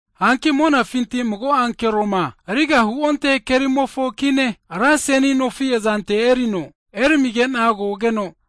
Hanki monafinti mago ankeroma riga huonte kerimofo kine, ra seni nofi azante erineno eramigena kogeno,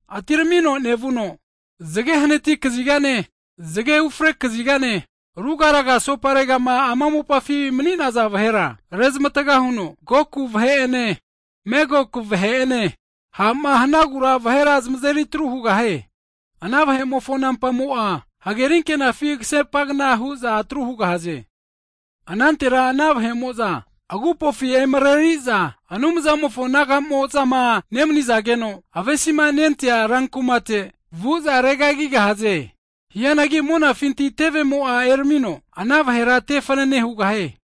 atiramino nevuno, zge hanati kazigane, zge ufre kazigane rugaraga soparegama ama mopafi mni'naza vahera rezmatga huno, Goku vahe'ene Megok vahe'ene ha'ma hanagura vahera zmazeri atru hugahaze. Ana vahe'mofo nampamo'a hagerinkenafi kasepankna hu'za atru hugahaze. Anantera ana vahemoza agupofi emareriza, Anumzamofo nagamo'zama nemanizageno avesima nentea rankumate vu'za ome regagigahaze. Hianagi monafinti tevemo'a eramino ana vahera te fnane hugahie.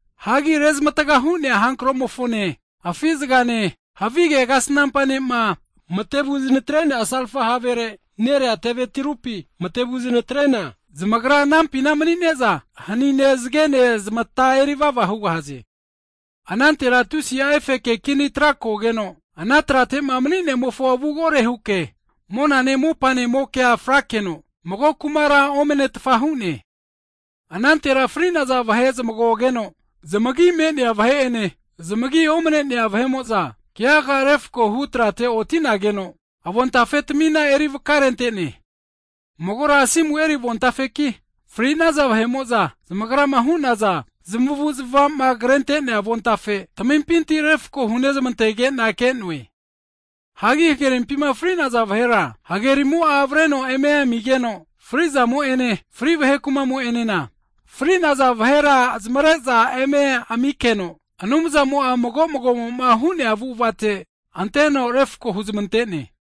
Hagi rezmatga hu'nea hankromofone, afi zgane, havige kasnampa ne'ma matevu zmatreniana salfa havere nerea teve tirupi mate vuzmatrena, zamagra anampina manine'za hanine zgena zmata erivava hugahaze. Anantera tusi'a efeke kini tra kogeno, ana tratema Mni'nemofo avu kore huke monane mopanemokea frakeno, mago kumara omnetfa hu'ne. Anantera fri'naza vahe zmagogeno, zmagi me'nea vahe'ene, zmagi omne'nea vahe'mo'za, keaga refkohu trate otinageno, avontafe tamina eri vakarentene, magora asimu eri avontafeki, fri'naza vahe'mo'za zamagrama hu'naza zmavuzmavama krente'nea avontafe tamimpinti refko hunezmantegena ke'noe. Hagi hagerimpima fri'naza vahera, hagerimo'a avreno eme amigeno, fri'zamo'ene, (Hedes) fri vahe kumamo'enena, fri'naza vahera zmavre'za eme aminkeno, Anumzamo'a mago mago'mo'ma hu'nea avu'avate anteno refko huzmantene.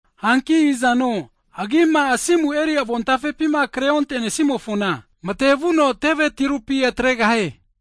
Hanki izano agima asimu eri avontafepima kre ontenesimofona, mate vuno teve tirupi atregahie.